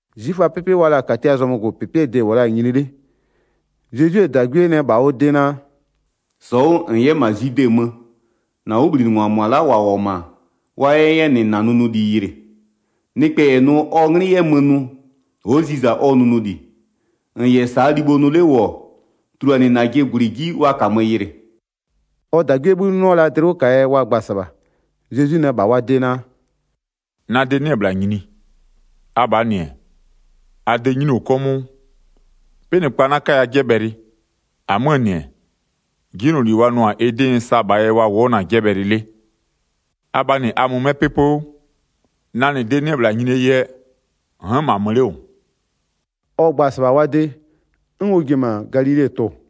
'Zwiföaa 'pɩpɩ wa la-a -Katiaa zɔmögʋpɩpɩɛ de-e -wʋ la-a nyini 'le. Zezwie -dagwie nɛ -bha ɔ de naa: “-Sɔ 'wʋ -n 'yɛ -ma Zwide mö, -na 'wʋbhlinɩngwa -mʋa la'a -wa -wʋ-ɔ -ma wa 'yɛ 'yɛ -nɩ -na nʋnʋli yɩlɩ. Nɩkpɛ -yɛ nʋ ɔ 'nglɩ 'yɛ mö nʋ, ɔ'ɔ ziza ɔ nʋnʋli. -N -yɛ -saa libho nʋ 'le -wʋ-ɔ, tuluanɩ -najɩ -gwlɩ 'ji wa -kamö yɩlɩ.” Ɔ -dagwiee 'bhï 'nɩɔ la dlɩ 'wʋ -kaa yɛ wa gba-a -sɩbha. Zezwi nɛ -bha wa de naa: “Na de 'nɩ-ɛ -bhla nyini, abhaa -nɩ-ɛ, a de 'nyinio 'kɔmʋʋ. 'Pɩnɩkpa 'na 'kaya -nɩ 'jɛbhɛlɩ, -amöö -nɩ-ɛ, 'jinyloli wa nʋ-a ɩ 'dɩ n sa -bhaa yɛ wa wʋ'ʋ-ɔ na-a 'jɛbhɛlɩ 'le. Abhaa -nɩ a mö 'mɛ 'pɩpɩ 'wʋ, na -nɩ de 'nɩ-ɛ -bhla nyinie yɛ, n'n -ma mö 'le -wʋ.” Ɔ gba-a -sɩbha wa de, 'n ɔ ji-e -ma Galile-e tʋ-ʋ.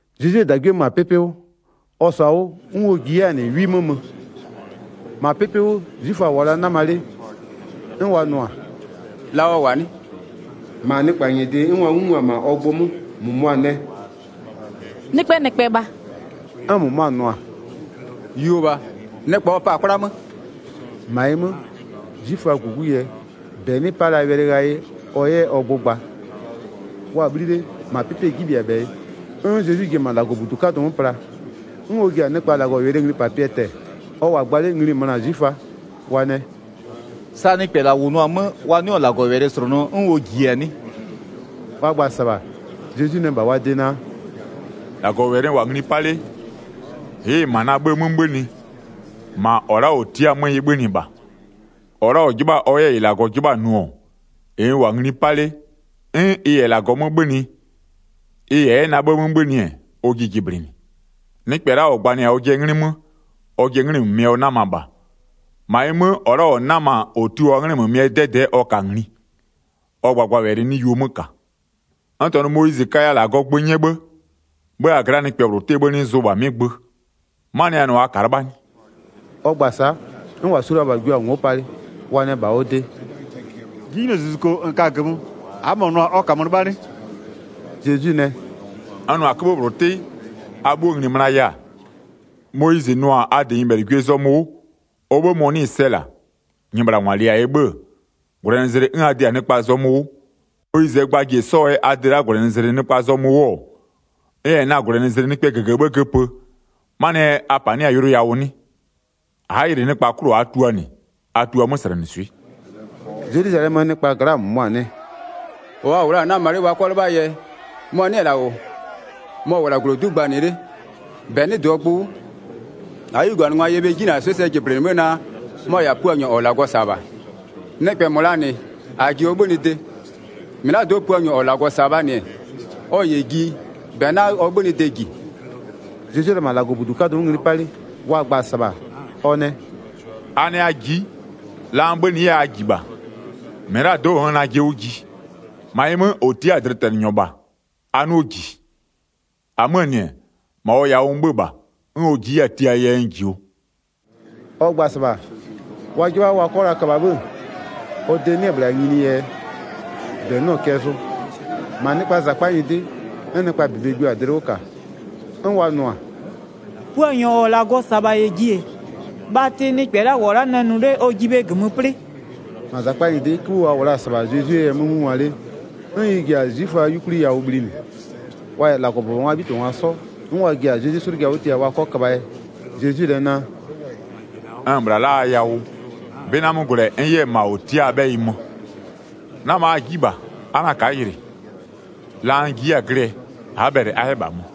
Zezwie -dagwie mö-a 'pɩpɩ 'wʋ, ɔ -sɔ-a 'wʋ 'n ɔ ji 'yɛ-a -nɩ 'wi 'mö mö. 11-Ma 'pɩpɩ 'wʋ 'zwiföa -wʋɔ la'a 'nama 'le, 'n wa nʋ-a: “La ɔ -wʋ-a 'nɩ?” 12-Ma nɩkpa -nyɩdɩ 'n wa 'ngungwa-a -ma ɔ gbʋ 'mö. -Mʋmʋa nɛ: “Nɩkpɛɛ -nɩkpɛ -bha”, 'n -mʋmʋa nʋ-a: “Yuo -bha, nɩkpa ɔ pa-a 'kwla 'mö.” 13-Ma ɩ 'mö, 'zwiföaa -gugu yɛ -bɛ 'nɩ 'pa la wɛlɩ ghayɩ ɔ 'yɛ ɔ gbʋ gba. Wa-a 'bhli 'le, -ma 'pɩpɩɛ 'jibhɩabhɛyɩ, 'n Zezwi ji-e -ma -Lagɔbudu 'kadʋ 'mö pla, 'n ɔ ji-a nɩkpa -Lagɔwɛlɩɛ nglipapɩɛ tɛ-ɛ. Ɔ -wʋ-a gba 'le, ngli-i möna-a 'zwiföa. Wa nɛ: “Sa nɩkpɛ -la -wʋnʋ-a 'mö, wa 'nɩɔ-ɔ -Lagɔwɛlɩ -slʋnʋ 'n ɔ -jiɩ-a 'nɩ?” Wa gba-a -sɩbha, Zezwi nɛ -bha wa de naa: “-Lagɔwɛlɩ n -wʋ-a ngli 'pa 'le, ɩ'ɩ-ɩ -ma na 'bhë 'mö 'bhönɩ, -ma -ɔ la'a -ɔ tia'a-a 'mö ɩ 'bhönɩ -bha. 17-Ɔ la'a -ɔ 'jɩbha-a ɔ 'yɛ -ɩ -Lagɔ 'jɩbha-a nʋ-ɔ, -ɩ n -wʋ-a ngli 'pa 'le, 'n ɩ -yɛ -Lagɔ 'mö 'bhönɩ, ɩ -yɛ 'yɛ na 'bhë 'mö 'bhönɩ-ɛ, ɔ jiɩ jɩblɩnɩ. Nɩkpɛ la'a -ɔ gbanɩ-a ɔjɩɛ 'nglɩ 'mö, ɔjɩɛ 'nglɩmömɩɛ ɔ 'nama -bha. -Ma ɩ 'mö, -ɔ la'a -ɔ 'nama-a -ɔ tio-aa 'nglɩmömɩɛ 'dɛdɛ'ɛ ɔ ka-a ngli, ɔ gbagbawɛlɩ 'nɩ yuo 'mö -ka. N -tɔnʋ Moyizɩ kaya -Lagɔɔ gbö 'nyɛ 'bhë? 'Bhë -ma a gla'aa nɩkpɛ -bhlʋɔ 'bhë 'nɩ zʋ -bha 'mɩ gbö. 'Manɩɛ yɛ a nʋ-a a ka'a 'lɩbha 'nɩ?” Ɔ gba-a sa'a, 'n -wa su la-a -bha jio-a ngo'o palɩ. Wa nɛ -bha ɔ de: “'Jinylozuzuko -n ka-a -gömö, a'a -mɔ nʋ-a ɔ -kamö 'lɩbha 'nɩ?” Zezwi nɛ: “N nʋ-a 'köbhë -bhlʋ 'tɩ, a 'bhuo -kpö ngli-i mönaya-a? Moyizɩ nʋ-a a -dɩ nyɩbhɛlɩgwiee zɔmö 'wʋ, ɔ 'bhë mɔ-ɔ 'nɩɩ-ɩ sɛ -la, nyɩbhlangwa -lɩɩ-a yɛ 'bhë-ë, -gwlɛnɩzlɩ 'n a dɩ-a nɩkpaa zɔmö 'wʋ. Moyizɩɛ gba ji-e 'sɔ-ɔɔ yɛ a dɩ la'a -gwlɛnɩzlɩ nɩkpaa zɔmö 'wʋ-ɔ, n -yɛ na-a -gwlɛnɩzlɩ nɩkpɛɛ -gëgëbhë göpö, 'manɩɛ yɛ a -panɩ'ɩ-a yʋlʋ yawʋ 'nɩ? A'a yɩlɩ nɩkpaa 'klʋ 'wʋ a'a tua -nɩ, a tua 'möslɛnɩswɩ'ɩ.” Zelwizalɛmöö nɩkpaa gla'aa -mʋmʋa nɛ: “-Ɔ wa -wʋ la-a 'nama 'le wa 'kɔ 'lɩbhaa yɛ, mɔ-ɔ 'nɩ-ɛ -la -wʋ-ɔ? Mɔ-ɔ -wʋ-ɔ -la -glodu'u gbanɩ 'le, -bɛ 'nɩ -dɩɔ gbʋ 'wʋ, -aa 'yuganɩngwa yɛ bhe 'jinanɩswɩ'ɩ sɛ jɩblɩnɩ 'bhë naa, mɔ-ɔ -yɛ-a Puanyɔ -ɔ -Lagɔ -sa-a -bha? Nɩkpɛ -mɔ -laa -nɩ -a -ji ɔ 'bhönɩde, -mɩlado'o Puanyɔ -ɔ -Lagɔ -sa-a -bhaa -nɩ, ɔ -yɛ ji -bɛ 'na ɔ 'bhönɩde -ji.” Zezwi-e la -ma -Lagɔbudu 'kadʋ 'mö ngli 'pa 'le, wa gba-a -sɩbha, ɔ nɛ: “A nɛ a ji'i, la n 'bhönɩ 'yɛ-a a -ji -bha, -mɩlado'o n'n-n najɩ 'wʋ ji. -Ma ɩ 'mö, -ɔ tia'a-a dlɩtɛnɩnyɔ -bha, a 'nɩɔ -ji. 29-Amöö -nɩ-ɛ, -ma ɔ yawʋ n 'bhö-ö -bha, 'n ɔ ji'i 'yɛ-a tiaa yɛ n -jio.” Ɔ gba-a -sɩbha, wa 'jɩbha wa 'kɔ la köbha 'bhë-ë, ɔ de 'nɩ-ɛ -bhla nyinie yɛ -bɛ 'nɩɔ-ɔ cɛ zʋ. 31-Ma nɩkpaa -zakpa nyɩdɩ 'n nɩkpaa -bebe jio-a dlɩ 'wʋ -ka, 'n wa nʋ-a: “Puanyɔ -ɔ -Lagɔ -sa-a -bha -yɛ ji-e, bhatɩ nɩkpɛ la'a -wʋ-ɔ la'a nɛ nʋ 'le, ɔ jiɩ bhe -gömö 'plɩ?” Wa yɛ Zezwi 'slʋja 'wʋ tia 32-Ma -zakpa nyɩdɩ 'kïbhï wa -wʋ la'a -sɩbha Zezwie yɛ 'mö 'ngungwa 'le, 'n ɩ ji-a falizɩɛɛ 'yukwlie yawʋ bhlinɩ. Wa -yɛ -Lagɔbʋbɔngwaa 'bhitɩbhangwa 'sɔ, 'n wa ji-a Zezwi 'slʋja 'wʋ tia wa 'kɔ köbhaa yɛ. Zezwi nɛ naa: “N-n -bhla la'a a yawʋ, 'bɩ 'na 'mö gwlɛ 'n n 'yɛ-ɛ -ma -ɔ tia'a-aa 'bhɛyɩ mö. 'Nama a ji'i -bha, a 'na ka'a yɩlɩ, la n ji 'yɛ-a glɩɛ, a'a bhɛlɩ a 'yɛ -bha mö.”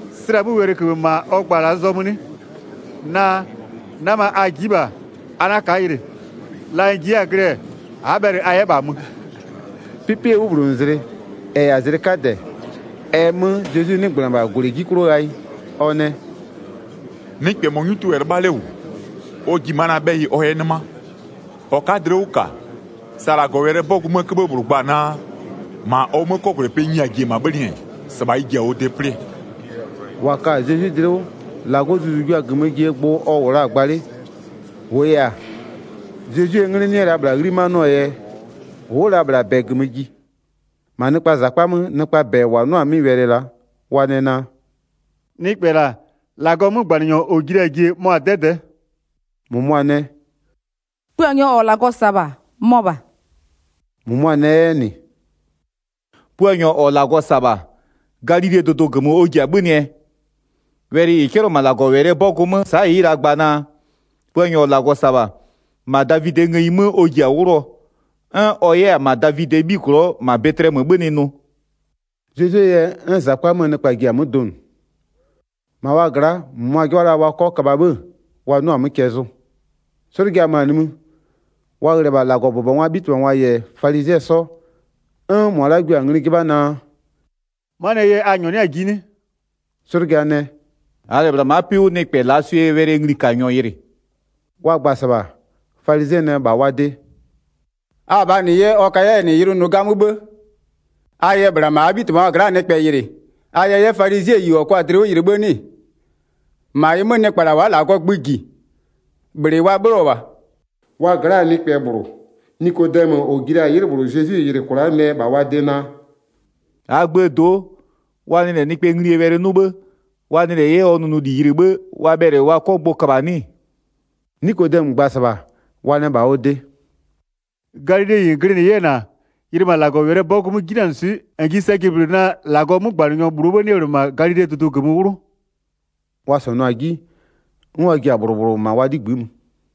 Slɛ-a 'mö wɛlɩköbhë -ma ɔ gba-a -laa zɔmö 'nɩ? Naa: 'Nama a ji'i -bha a 'na ka'a yɩlɩ, la n ji 'yɛ-a glɩɛ a'a bhɛlɩ a 'yɛ -bha mö?” 'Pɩpɩɛ 'wʋbhlonʋzlɩ -ɛ -yɛ-a zlɩ 'kadɛ, ɛ 'mö Zezwi 'nɩgbönɩ-ɛ -bha -gwlɩ 'ji 'klʋ ghayɩ, ɔ nɛ: “Nɩkpɛ -mɔ 'nyutʋ -yɛ 'lɩbha 'le -wʋ, ɔ ji ma'a na 'bhɛyɩ ɔ 'yɛ 'nɩma. 38-Ɔ ka'a dlɩ 'wʋ -ka, sa -Lagɔwɛlɩɛ 'bɔgʋ 'möö 'köbhë -bhlʋ gba-a naa: -Ma ɔ 'mö 'kɔgwlɛpɩɛ nyia-a ji-e -ma 'bhönɩɛ, -sɩbha ɩ ji-a ɔ de 'plɩɛ.” 39-Wa ka-a Zezwi dlɩ 'wʋ -Lagɔɔ Zuzu-u jua-a -gömö jie gbʋ ɔ -wʋ la-a gba 'le. -Wʋʋ yɛ-a, Zezwie 'nglɩ 'nɩ la -bhla 'ghlimanɩɔɔ yɛ, ʋ'ʋ-ʋ la -bhla -bɛ -gömö ji. Nɩkpa yɛ Zezwie yɛ 'mö donʋ 40-Ma nɩkpaa -zakpa 'möö nɩkpaa -bɛ -wa 'nʋ-a 'mɩ wɛlɩ la'a, wa nɛ naa: “Nɩkpɛ -la, -Lagɔɔ 'mögbanɩnyɔ -ɔ ji la-a jie mɔ-a 'dɛdɛ'ɛ.” 41-Mʋmʋa nɛ: “Puanyɔ -ɔ -Lagɔ -sa-a -bha, mɔ -bha.” -Mʋmʋa nɛ 'yɛ -nɩ: “Puanyɔ -ɔ -Lagɔ -sa-a -bha, Galilee dʋdʋ -gömö ɔ ji-a 'bhönɩɛ? 42Wɛlɩ -ɩ 'cɛlɩɔ-ɔ -ma -Lagɔwɛlɩɛ 'bɔgʋ 'mö, sa'a ɩ'ɩ-ɩ la gba naa: Puanyɔ -ɔ -Lagɔ -sa-a -bha, -ma Davidɩɛ ngëyi 'mö ɔ ji-a 'wlʋɔ, 'n ɔ 'yɛ-ɛ -ma Davidɩɛ 'bhiglɔ'ɔ, -ma Bɛtɩlɛmö 'bhönɩ nʋ?” 43Zezwie yɛ 'n -zakpa 'möö nɩkpa ji-a 'mö donʋ. 44-Ma wa gla'a -mʋmʋa 'jɩbha la wa 'kɔ köbha 'bhë wa 'nɩɔ-a 'mö cɛ zʋ. 'Zwiföaa 'yuganɩngwa 'nɩ Zezwi dlɩ 'wʋ -ka 45'Slʋja mö-a nimï, wa ghlɩ-ɛ -bha -Lagɔbʋbɔngwaa 'bhitɩbhangwa -yɛ falizɩɛ 'sɔ, 'n -mʋa la'a jua-a ngli 'jɩbha naa: “'Manɩɛ yɛ a -nyɔɔ 'nɩ-a ji 'nɩ?” 46'Slʋja nɛ: “-Aa -lɛ -bhla ma'a 'pɩ 'wʋ nɩkpɛ -laa swɩɛ wɛlɩɛ nglikanyɔ yɩlɩ.” 47Wa gba-a -sɩbha, falizɩɛ nɛ -bha wa de: “Abhaa -nɩ 'yɛ, ɔ kaya 'yɛ -nɩ yʋlʋ nʋ 'gamö 'bhë? 48A yɛ -bhla -ma -aa 'bhitɩbhangwa gla'aa nɩkpɛ yɩlɩ, a yɛ 'yɛ falizɩɛyi -ɔ kɔ-a dlɩ 'wʋ yɩlɩ 'bhë 'nɩ-ɩ? 49-Ma ɩ 'mö, nɩkpa -la wa'a -Lagɔɔ gbö -ji, -bhlɩ wa 'bhlɩɔ -bha.” 50Wa gla'aa nɩkpɛ -bhlʋ, Nikodɛmö -ɔ ji la-a 'ylɩ -bhlʋ Zezwi yɩlɩ kwla'a nɛ -bha wa de naa: 51“-Aa gböö do'o, wa nɩ -lɛ nɩkpɛɛ nglie wɛlɩ 'nʋ 'bhë, wa nɩ 'yɛ -lɛ ɔ nʋnʋli yɩlɩ 'bhë, wa bhɛlɩ wa 'kɔ gbʋ köbha-a 'nɩ-ɩ?” 52Nikodɛmö gba-a -sɩbha, wa nɛ -bha ɔ de: “Galileyi -n glɩnɩ 'yɛ-ɛ -na-a? Yɩlɩ -ma -Lagɔwɛlɩɛ 'bɔgʋ 'mö 'jinanɩswɩ'ɩ, -n ji sɛ jɩblɩnɩ naa -Lagɔɔ 'mögbanɩnyɔ -bhlʋɔ 'bhë 'nɩ-ɛ -bhla -ma Galilee dʋdʋ -gömö 'wlʋ.” [ 53Wa -sɔnʋ-a 'ji, 'n wa ji-a -bhlʋ -bhlʋ -ma wa 'ligbï'ï mö.